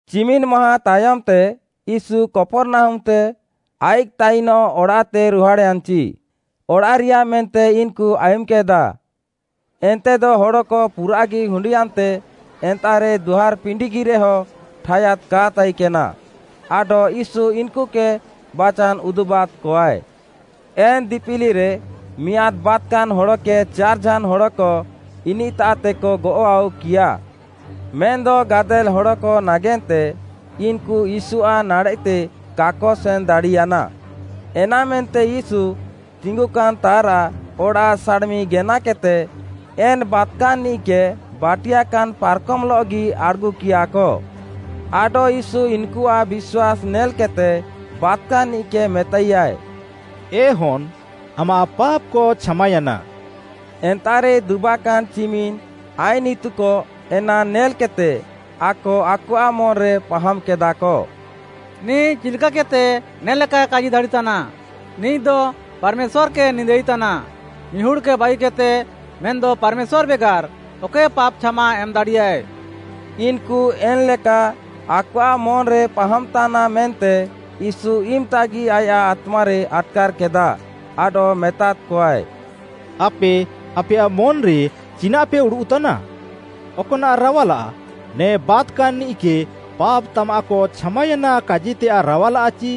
ଚିମିନ୍‌ ମାହାଁ ତାୟମ୍‌ତେ, ୟୀଶୁ କପର୍‌ନାହୁମ୍‌ତେ ଆଇଃକ୍‌ ତାଇନଃ ଅଡ଼ାଃତେ ରୁହାଡ଼୍‌ୟାନ୍‌ଚି, ଅଡ଼ାଃରିୟା ମେନ୍ତେ ଇନ୍‌କୁ ଆୟୁମ୍‌କେଦା, ଏନ୍ତେଦ ହଡ଼କ ପୁରାଃଗି ହୁଣ୍ଡିୟାନ୍ତେ ଏନ୍ତାଃରେ ଦୁଆର୍‌ପିଣ୍ଡିଗିରେହ ଠାୟାଦ୍‌ କା ତାଇକେନା, ଆଡଃ ୟୀଶୁ ଇନ୍‌କୁକେ ବାଚାନ୍‌ ଉଦୁବାଦ୍‌କଆଏ। ଏନ୍‌ ଦିପିଲିରେ, ମିଆଁଦ୍‌ ବାତ୍‌କାନ୍‌ ହଡ଼କେ ଚାର୍‌ଝାନ୍‌ ହଡ଼କ ଇନିଃତାଃତେକ ଗଅଃ ଆଉକିୟା। ମେନ୍‌ଦ ଗାଦେଲ୍‌ ହଡ଼କ ନାଗେନ୍ତେ ଇନ୍‌କୁ ୟୀଶୁଆଃ ନାଡ଼େଃତେ କାକ ସେନ୍‌ଦାଡ଼ିୟାନା। ଏନାମେନ୍ତେ ୟୀଶୁ ତିଙ୍ଗୁକାନ୍‌ତାଃରାଃ ଅଡ଼ାଃ ସାଡ଼୍‌ମି ଗେନାକେଦ୍‌ତେ, ଏନ୍‌ ବାତ୍‌କାନ୍‌ନିଃକେ, ବାଟିୟାକାନ୍‌ ପାର୍‌କମ୍‌ଲଃଗି ଆଡ଼୍‌ଗୁକିୟାକ। ଆଡଃ ୟୀଶୁ ଇନ୍‌କୁଆଃ ବିଶ୍ୱାସ୍‌ ନେଲ୍‌କେଦ୍‌ତେ ବାତ୍‌କାନ୍‌ନିଃକେ ମେତାଇୟାଏ, “ଏ ହନ୍‌ ଆମାଃ ପାପ୍‌କ ଛାମାୟାନା।” ଏନ୍ତାଃରେ ଦୁବାକାନ୍‌ ଚିମିନ୍‌ ଆଇନ୍‌ ଇତୁକ ଏନା ନେଲ୍‌କେଦ୍‌ତେ ଆକ ଆକଆଃ ମନ୍‌ରେ ପାହାମ୍‌କେଦାଃକ, “ନିଃ ଚିଲ୍‌କାକେଦ୍‌ତେ ନେ ଲେକାଏ କାଜି ଦାଡ଼ିତାନ୍‌? ନିଃଦ ପାର୍‌ମେଶ୍ୱାର୍‌କେ ନିନ୍ଦାଇତାନା, ମିହୁଡ଼୍‌କେ ବାଗିକେଦ୍‌ତେ, ମେନ୍‌ଦ ପାର୍‌ମେଶ୍ୱାର୍‌ ବେଗାର୍‌ ଅକଏ ପାପ୍‌ ଛାମା ଏମ୍‌ ଦାଡ଼ିୟାଏ।” ଇନ୍‌କୁ ଏନ୍‌ଲେକା ଆକଆଃ ମନ୍‌ରେ ପାହାମ୍‌ତାନା ମେନ୍ତେ ୟୀଶୁ ଇମ୍‌ତାଗି ଆୟାଃ ଆତ୍ମାରେ ଆଟ୍‌କାର୍‌କେଦା, ଆଡଃ ମେତାଦ୍‌କଆଏ, “ଆପେ ଆପେୟାଃ ମନ୍‌ରେ ଚିନାଃପେ ଉଡ଼ୁଃତାନା?” ଅକ୍‌ନାଃ ରାୱାଲାଃ, ନେ ବାତ୍‌କାନ୍‌ନିଃକେ “ପାପ୍‌ ତାମାଃକ ଛାମାୟାନା” କାଜିତେୟାଃ ରାୱାଲାଃ ଚି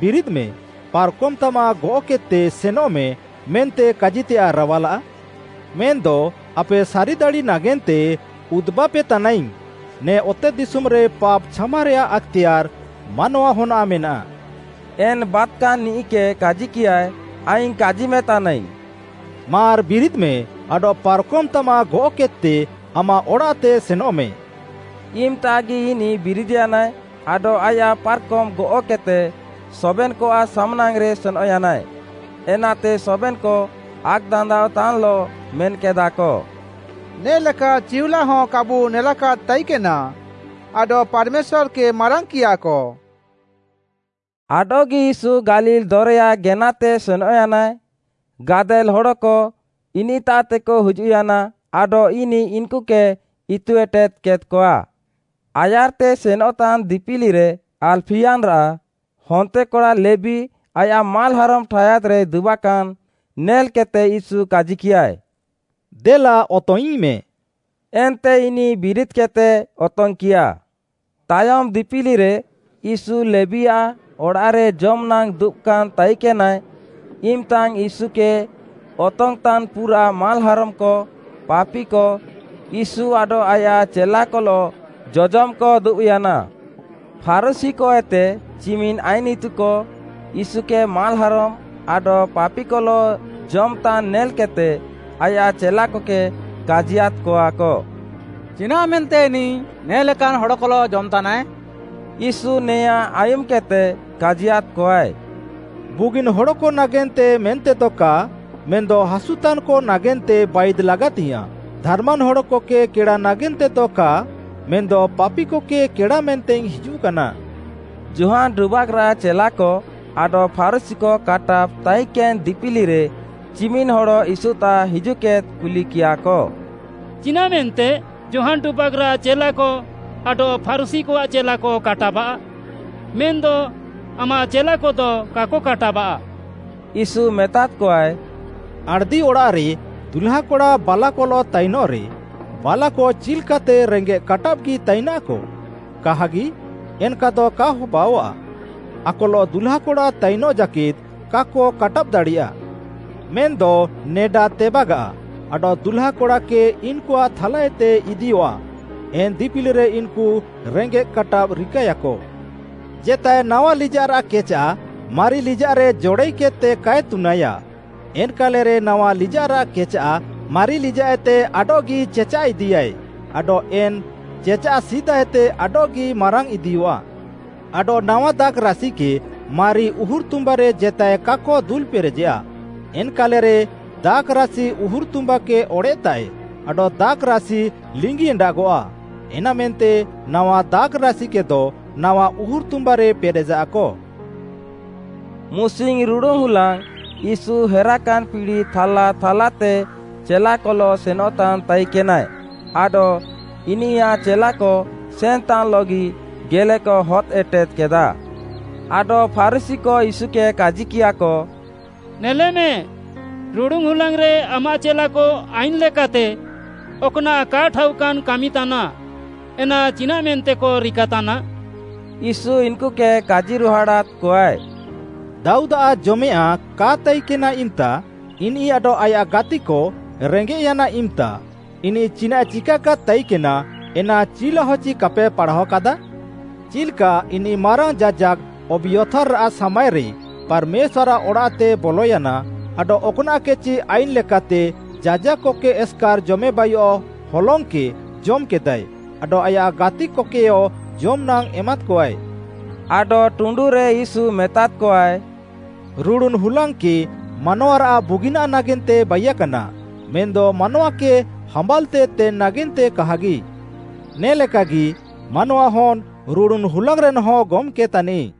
“ବିରିଦ୍‌ମେ, ପାର୍‌କମ୍‌ ତାମାଃ ଗଅଃକେଦ୍‌ତେ ସେନଃମେ” ମେନ୍ତେ କାଜିତେୟାଃ ରାୱାଲା? ମେନ୍‌ଦ ଆପେ ସାରିଦାଡ଼ି ନାଗେନ୍ତେ ଉଦୁବାପେତାନାଇଙ୍ଗ୍‌ ନେ ଅତେଦିଶୁମ୍‌ରେ ପାପ୍‌ ଛାମାରେୟାଃ ଆକ୍‌ତେୟାର୍‌ ମାନୱାହନ୍‌ଆଃ ମେନାଃ, ଏନ୍‌ ବାତ୍‌କାନ୍‌ନିଃକେ କାଜିକିୟାଏ, ଆଇଙ୍ଗ୍‌ କାଜିମେତାନାଇଙ୍ଗ୍‌, “ମାର୍‌ ବିରିଦ୍‌ମେ ଆଡଃ ପାର୍‌କମ୍‌ତାମାଃ ଗଅଃକେଦ୍‌ତେ ଆମାଃ ଅଡ଼ାଃତେ ସେନଃମେ।” ଇମ୍‌ତାଗି ଇନିଃ ବିରିଦ୍‌ୟାନାଏ, ଆଡଃ ଆୟାଃ ପାର୍‌କମ୍‌ ଗଅଃକେଦ୍‌ତେ ସବେନ୍‌କଆଃ ସାମ୍‌ନାଙ୍ଗ୍‌ରେ ସେନଃୟାନାଏ, ଏନାତେ ସବେନ୍‌କ ଆକ୍‌ଦାନ୍ଦାଅଃତାନ୍‌ଲଃ ମେନ୍‌କେଦାଃକ “ନେ ଲେକା ଚିଉଲାହ କାବୁ ନେଲାକାଦ୍‌ ତାଇକେନା, ଆଡଃ ପାର୍‌ମେଶ୍ୱାର୍‌କେ ମାରାଙ୍ଗ୍‌କିୟାକ।” ଆଡଃଗି ୟୀଶୁ ଗାଲିଲ୍‌ ଦରେୟା ଗେନାତେ ସେନଃୟାନାଏ, ଗାଦେଲ୍‌ ହଡ଼କ ଇନିଃତାଃକ ହିଜୁଃୟାନା ଆଡଃ ଇନିଃ ଇନ୍‌କୁକେ ଇତୁ ଏଟେଦ୍‌କେଦ୍‌କଆ। ଆୟାର୍‌ତେ ସେନଃତାନ୍‌ ଦିପିଲିରେ ଆଲ୍‌ଫିୟାନ୍‌ରାଃ ହନ୍ତେକଡ଼ା ଲେବୀ ଆୟାଃ ମାଲ୍‌ହାରମ୍‌ ଠାୟାଦ୍‌ରେ ଦୁବାକାନ୍‌ ନେଲ୍‌କେଦ୍‌ତେ ୟୀଶୁ କାଜିକିୟାଏ, “ଦେଲା ଅତଙ୍ଗ୍‌ଇଙ୍ଗ୍‌ମେ।” ଏନ୍ତେ ଇନିଃ ବିରିଦ୍‌କେଦ୍‌ତେ ଅତଙ୍ଗ୍‌କିୟା। ତାୟମ୍‌ ଦିପିଲିରେ ୟୀଶୁ ଲେବୀଆଃ ଅଡ଼ାଃରେ ଜମ୍‌ନାଙ୍ଗ୍‌ ଦୁବାକାନ୍‌ ତାଇକେନାଏ, ଇମ୍‌ତାଙ୍ଗ୍‌ ୟୀଶୁକେ ଅତଙ୍ଗ୍‌ଇଁତାନ୍‌ ପୁରାଃ ମାଲ୍‌ହାରମ୍‌କ, ପାପିକ ୟୀଶୁ ଆଡଃ ଆୟାଃ ଚେଲାକଲଃ ଜଜମ୍‌କ ଦୁବ୍‌ୟାନା। ଫାରୁଶୀକଏତେ ଚିମିନ୍‌ ଆଇନ୍‌ ଇତୁକ, ୟୀଶୁକେ ମାଲ୍‌ହାରମ୍‌ ଆଡଃ ପାପିକଲଃ ଜମ୍‌ତାନ୍ ନେଲ୍‌କେଦ୍‌ତେ ଆୟାଃ ଚେଲାକକେ କାଜିୟାଦ୍‌କଆକ “ଚିନାଃମେନ୍ତେ ଇନିଃ ନେ ଲେକାନ୍‌ ହଡ଼କଲଃ ଜମ୍‌ତାନାଏ?” ୟୀଶୁ ନେୟାଁ ଆୟୁମ୍‌କେଦ୍‌ତେ କାଜିୟାଦ୍‌କଆଏ, “ବୁଗିନ୍‌ ହଡ଼କ ନାଗେନ୍ତେ ମେନ୍ତେଦ କା, ମେନ୍‌ଦ ହାସୁତାନ୍‌କ ନାଗେନ୍ତେ ବାଇଦ୍‌ ଲାଗାତିଙ୍ଗ୍‌ୟାଁଃ, ଧାର୍‌ମାନ୍‌ ହଡ଼କକେ କେଡ଼ା ନାଗେନ୍ତେଦ କା ମେନ୍‌ଦ ପାପିକକେ କେଡ଼ା ମେନ୍ତେଇଙ୍ଗ୍‌ ହିଜୁଃକାନା।” ଯୋହାନ୍‌ ଡୁବାକ୍‌ରାଃ ଚେଲାକ ଆଡଃ ଫାରୁଶୀକ କାଟାବ୍‌ ତାଇକେନ୍‌ ଦିପିଲିରେ ଚିମିନ୍‌ ହଡ଼ ୟୀଶୁତାଃ ହିଜୁଃକେଦ୍‌ତେ କୁଲିକିୟାକ, “ଚିନାଃମେନ୍ତେ ଯୋହାନ୍‌ ଡୁବାକ୍‌ରାଃ ଚେଲାକ ଆଡଃ ଫାରୁଶୀକଆଃ ଚେଲାକ କାଟାବାଃ? ମେନ୍‌ଦ ଆମାଃ ଚେଲାକଦ କାକ କାଟାବାଃ?” ୟୀଶୁ ମେତାଦ୍‌କଆଏ, “ଆଣ୍‌ଦିଅଡ଼ାଃରେ ଦୁହ୍ଲାକଡ଼ା ବାଲାକଲଃ ତାଇନଃରେ, ବାଲାକ ଚିଲ୍‌କାତେ ରେଙ୍ଗେଃ କାଟାବ୍‌ଗି ତାଇନାଃକ? କାହାଗି, ଏନ୍‌କାଦ କା ହବାଅଆଃ ଆକଲଃ ଦୁହ୍ଲାକଡ଼ା ତାଇନଃ ଜାକେଦ୍‌ କାକ କାଟାବ୍‌ ଦାଡ଼ିୟାଃ।” ମେନ୍‌ଦ ନେଡା ତେବାଗାଃ, ଆଡଃ ଦୁହ୍ଲାକଡ଼ାକେ ଇନ୍‌କୁଆଃ ଥାଲାଏତେ ଇଦିୟଃଆ, ଏନ୍‌ ଦିପିଲିରେ ଇନ୍‌କୁ ରେଙ୍ଗେଃ କାଟାବ୍‌ ରିକାଏୟାକ। “ଜେତାଏ ନାୱା ଲିଜାଃରାଃ କେଚାଃ ମାରି ଲିଜାଃରେ ଜଡ଼ାଇକେଦ୍‌ତେ କାଏ ତୁନାଏୟା, ଏନ୍‌କାଲେରେ ନାୱା ଲିଜାଃରାଃ କେଚାଃ ମାରି ଲିଜାଃଏତେ ଆଡଃଗି ଚେଚାଃ ଇଦିୟାଏ, ଆଡଃ ଏନ୍‌ ଚେଚାଃ ସିଦାଏତେ ଆଡଃଗି ମାରାଙ୍ଗ୍‌ ଇଦିୟଃଆ। ଆଡଃ ନାୱା ଦାଖ୍‌ରାସିକେ ମାରି ଉହୁର୍‌ତୁମ୍ବାରେ ଜେତାଏ କାକ ଦୁଲ୍‌ପେରେଜେୟା, ଏନ୍‌କାଲେରେ ଦାଖ୍‌ରାସି ଉହୁର୍‌ତୁମ୍ବାକେ ଅଡ଼େଃତାଃଏ ଆଡଃ ଦାଖ୍‌ରାସି ଲିଙ୍ଗି ଏଣ୍ଡାଗଃଆ, ଏନାମେନ୍ତେ ନାୱା ଦାଖ୍‌ରାସିକେଦ ନାୱା ଉହୁର୍‌ତୁମ୍ବାରେ ପେରେଜାଃକ।” ମୁସିଙ୍ଗ୍‌ ରୁଡ଼ୁନ୍‌ ହୁଲାଙ୍ଗ୍‌ ୟୀଶୁ ହେରାକାନ୍‌ ପିଡ଼ି ଥାଲାଥାଲାତେ ଚେଲାକଲଃ ସେନଃତାନ୍‌ ତାଇକେନାଏ, ଆଡଃ ଇନିୟାଃ ଚେଲାକ ସେନ୍‌ତାନ୍‌ଲଃ ଗେଲେକ ହଦ୍‌ ଏଟେଦ୍‌କେଦା। ଆଡଃ ଫାରୁଶୀକ ୟୀଶୁକେ କାଜିକିୟାଃକ, “ନେଲେମେ, ରୁଡ଼ୁନ୍‌ ହୁଲାଙ୍ଗ୍‌ରେ ଆମାଃ ଚେଲାକ ଆଇନ୍‌ ଲେକାତେ ଅକ୍‌ନାଃ କା ଠାଉକାନ୍‌ କାମି ତାନାଃ, ଏନା ଚିନାଃମେନ୍ତେକ ରିକାତାନା?” ୟୀଶୁ ଇନ୍‌କୁକେ କାଜିରୁହାଡ଼ାଦ୍‌କଆଏ, “ଦାଉଦ୍‌ଆଃ ଜମେୟାଃଁ କା ତାଇକେନା ଇମ୍‌ତା ଇନିଃ ଆଡଃ ଆୟାଃ ଗାତିକ ରେଙ୍ଗେଃୟାନ୍‌ ଇମ୍‌ତା, ଇନିଃ ଚିନାଃଏ ଚିକାକାଦ୍‌ ତାଇକେନା, ଏନା ଚିଉଲାହ ଚି କାପେ ପାଢ଼ାଅକାଦା? ଚିଲ୍‌କା ଇନିଃ ମାରାଙ୍ଗ୍‌ ଯାଜାକ୍‌ ଅବିୟାଥର୍‌ରାଃ ସାମାଏରେ ପାର୍‌ମେଶ୍ୱାର୍‌ଆଃ ଅଡ଼ାଃତେ ବଲୟାନା ଆଡଃ ଅକ୍‌ନାଃକେଚି ଆଇନ୍‌ ଲେକାତେ ଯାଜାକ୍‌କକେ ଏସ୍‌କାର୍‌ ଜମେବାଇୟଃ ହଲଙ୍ଗ୍‌କେ ଜମ୍‌କେଦାଏ ଆଡଃ ଆୟାଃ ଗାତିକକେୟ ଜମ୍‌ନାଙ୍ଗ୍‌ ଏମାଦ୍‌କଆଏ।” ଆଡଃ ଟୁଣ୍ଡୁରେ ୟୀଶୁ ମେତାଦ୍‌କଆଏ, “ରୁଡ଼ୁନ୍‌ ହୁଲାଙ୍ଗ୍‌କେ ମାନୱାରାଃ ବୁଗିନାଃ ନାଗେନ୍ତେ ବାଇୟାକାନା, ମେନ୍‌ଦ ମାନୱାକେ ହାମ୍ବାଲ୍‌ତେ ତେନ୍‌ ନାଗେନ୍ତେ କାହାଗି। ନେ ଲେକାଗି ମାନୱାହନ୍‌ ରୁଡ଼ୁନ୍‌ ହୁଲାଙ୍ଗ୍‌ରେନ୍‌ ହଁ ଗମ୍‌କେ ତାନିଃ।”